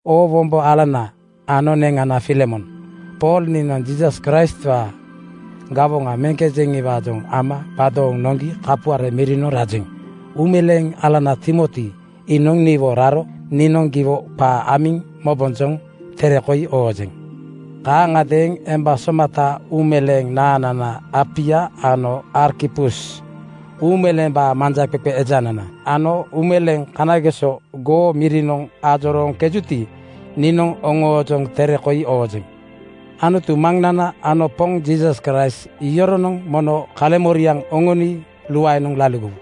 Oo wombo alana ano neŋana Filemon. Pool niinoŋ Jiisas Kraistwaa gawoŋa meŋkejeŋiwaajoŋ ama gbadooŋ noŋgi kapuare mirinoŋ rajeŋ. Uumeleeŋ alana Timoti iinoŋ niwo raro niinoŋ giwo qaa amiŋ mobojoŋ tere koi oojeŋ. Kaaŋagadeeŋ emba somata uumeleeŋ naaŋnana Apia ano Arkipus uumeleembaa manjaqeqe ejanana ano uumeleeŋ kanageso goo mirinoŋ ajorooŋkejuti, niinoŋ oŋoojoŋ tere koi oojeŋ. Anutu Maŋnana ano Poŋ Jiisas Kraist yoronoŋ mono kaleŋmoriaŋ oŋoni luaenoŋ laligowu.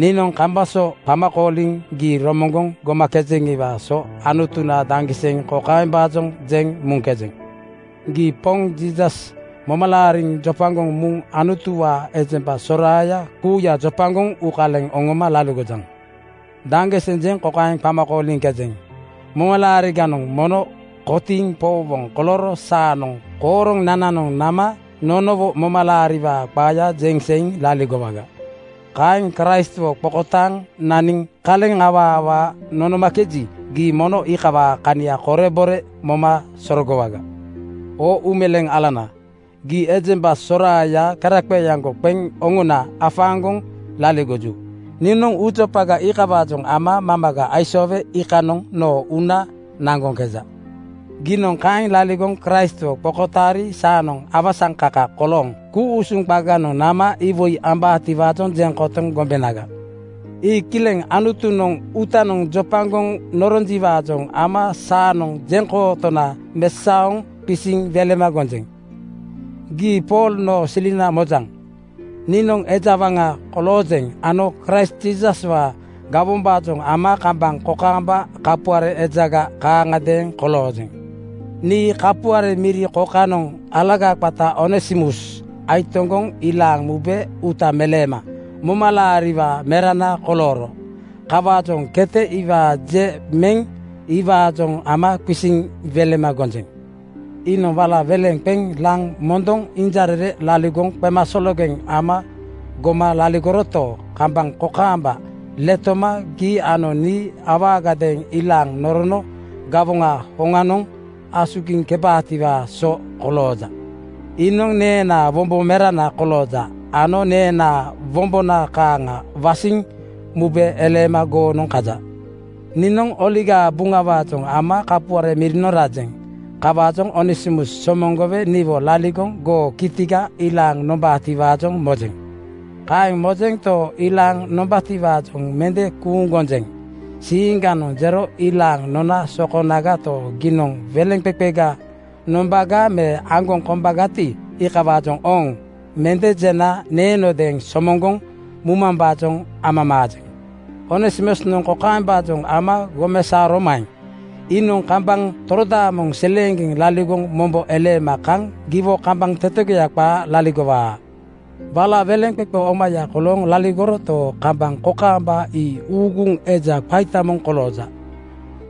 Niinoŋ kambaŋ so qama kooliŋ gii romoŋgoŋ gomakejeŋiwaa so Anutuna daŋgiseŋ kokaembaajoŋ jeŋ muŋkejeŋ: Gii Poŋ Jiisas moma laariŋ jopagoŋ muŋ Anutuwaa ejemba soraaya kuuya jopagoŋ uukaleŋ oŋoma laligojaŋ. Daŋgiseŋ jeŋ kokaeŋ qama kooliŋkejeŋ: Momalaariganoŋ mono kotiiŋ powowoŋ kolooro saanoŋ kooronananoŋ nama nonowo momalaariwaa qaaya jeŋ seiŋ laligowaga. Kaeŋ Kraistwo qokotaaŋ naniŋ kaleŋ awaa awaa nonomakeji, gii mono iikawaa kania korebore moma sorogowaga. Oo uumeleeŋ alana, gii ejemba soraaya keraqeeaŋgo qeŋ oŋona afaaŋgoŋ laligoju. Niinoŋ uujopaga iikawaajoŋ ama mamaga aisoowe iikanoŋ noo uuna naŋgoŋkeja. Giinoŋ kaeŋ laligoŋ Kraistwo qokotaari saanoŋ awasaŋkaka kolooŋ ku-usuŋ qaganoŋ nama iwoi ambaatiwaajoŋ jeŋ kotoŋ gombenaga. Ii kileŋ Anutunoŋ uutanoŋ jopagoŋ noronjiwaajoŋ ama saanoŋ jeŋkootona mesaoŋ qisiŋ welema gonjeŋ. Gii Pool noo silina mojaŋ. Niinoŋ eja waŋa koloojeŋ ano Kraist Jiisaswaa gawombaajoŋ ama kambaŋ kokaamba kapuare ejaga kaaŋagadeeŋ koloojeŋ. Nii kapuare miri kokanoŋ alaga qata Onesimus aitoŋgoŋ ilaaŋ mube uuta meleema momalaariwaa merana kolooro. Kawaajoŋ kete iwaa je meŋ iwaajoŋ ama qisiŋ welema gonjeŋ. Iinoŋ wala weleŋ qeŋ laŋ mondoŋ injarere laligoŋ qemasologeŋ ama goma laligoroto, kambaŋ kokaamba letoma gii ano nii awaagadeeŋ ilaaŋ norono gawoŋaa hoŋanoŋ asugiŋkebaatiwaa so kolooja. Iinoŋ neenaa wombo merana kolooja ano neenaa wombona kaaŋa wasiŋ mube eleema goonoŋ kaja. Niinoŋ Oligaa Buŋawaajoŋ ama kapuare mirinoŋ rajeŋ. Kawaajoŋ Onesimus somoŋgowe niwo laligoŋ goo kitiga ilaaŋ nombaatiwaajoŋ mojeŋ. Kaeŋ mojento, ilaaŋ nombaatiwaajoŋ mende kuuŋ gonjeŋ. Siiŋganoŋ jero ilaaŋ nona sokonagato, giinoŋ weleŋqeqega nombaga me aŋgoŋ kombagati, iikawaajoŋ “Ooŋ!” mende jena neenodeeŋ somoŋgoŋ mumambaajoŋ amamaajeŋ. Onesimusnoŋ kokaembaajoŋ ama gomesaoromaeŋ? Iinoŋ kambaŋ torodaamoŋ seleeŋgeŋ laligoŋ mombo eleema kaŋ giwo kambaŋ tetegoya qaa laligowaa. Wala weleŋqeqe omaya kolooŋ laligoroto, kambaŋ kokaamba ii uuguŋ eja qaita moŋ kolooja.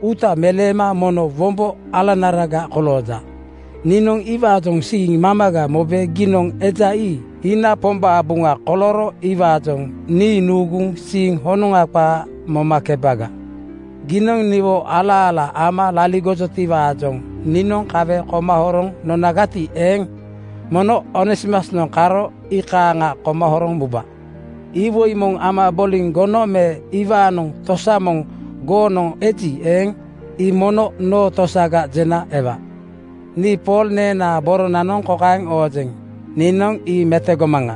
Uuta meleema mono wombo alanaraga kolooja. Niinoŋ iwaajoŋ siiŋ mamaga mobe giinoŋ eja ii iina Pombaa buŋa kolooro iwaajoŋ nii nuuguŋ siiŋ honoŋa qaa momakebaga. Giinoŋ niwo ala-ala ama laligojotiwaajoŋ niinoŋ kawe koma horoŋ nonagati eeŋ, mono Onesimusnoŋ karo iikaaŋa koma horoŋ muba. Iwoi moŋ ama boliŋ gono me iwaanoŋ tosa moŋ goonoŋ eji eeŋ, ii mono noo tosaga jena ewa. Nii Pool neenaa boronanoŋ kokaeŋ oojeŋ, “Niinoŋ ii metogomaŋa.”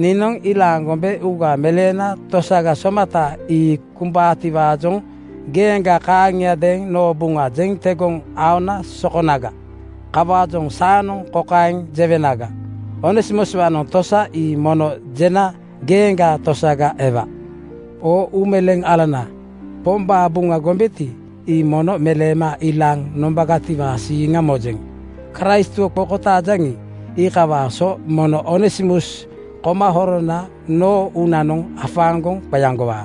Niinoŋ ilaaŋ gombe uuga meleena tosaga somata ii kumbaatiwaajoŋ geeŋga kaaŋiadeeŋ noo buŋa jeŋ tegoŋ aona sokonaga. Kawaajoŋ saanoŋ kokaeŋ jewenaga: Onesimuswaanoŋ tosa ii mono jena geeŋgaa tosaga ewa. Oo uumeleeŋ alana, Pombaa Buŋa gombeti, ii mono meleema ilaaŋ nombagatiwaa siiŋa mojeŋ. Kraistwo qokotaajaŋi, iikawaa so mono Onesimus koma horona noo uunanoŋ afaaŋgoŋ qeaŋgowaa.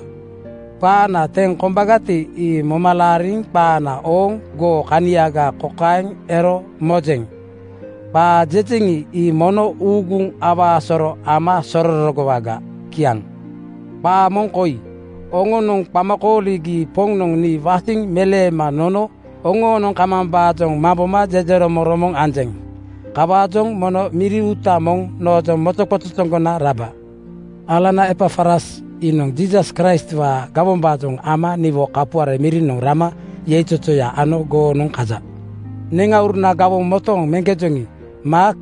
Qaana teŋ kombagati, ii moma laariŋ qaana ooŋ goo kaniaga kokaeŋ ero mojeŋ: Qaa jejeŋi, ii mono uuguŋ awaa soro ama sororogowaga. Kiaŋ. Qaa moŋ koi: Oŋonoŋ qama kooligi Poŋnoŋ nii wasiŋ meleema nono oŋoonoŋ kamambaajoŋ mamboma jejeromoŋromoŋ anjeŋ. Kawaajoŋ mono miri uuta moŋ noojoŋ mojoqojojoŋgona raba. Alana Epafras iinoŋ Jiisas Kraistwaa gawombaajoŋ ama niwo kapuare mirinoŋ rama yeizozoya ano goonoŋ kaja. Neŋauruna gawoŋ motooŋ meŋkejoŋi Maak,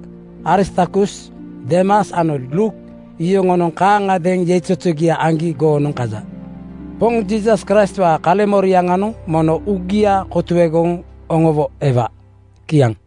Aristarkus, Deemas ano Luuk yoŋonoŋ kaaŋagadeeŋ yeizozogia aŋgi goonoŋ kaja. Poŋ Jiisas Kraistwaa kaleŋmorianoŋ mono uŋagia kotuegoŋ oŋowo ewa. Kiaŋ.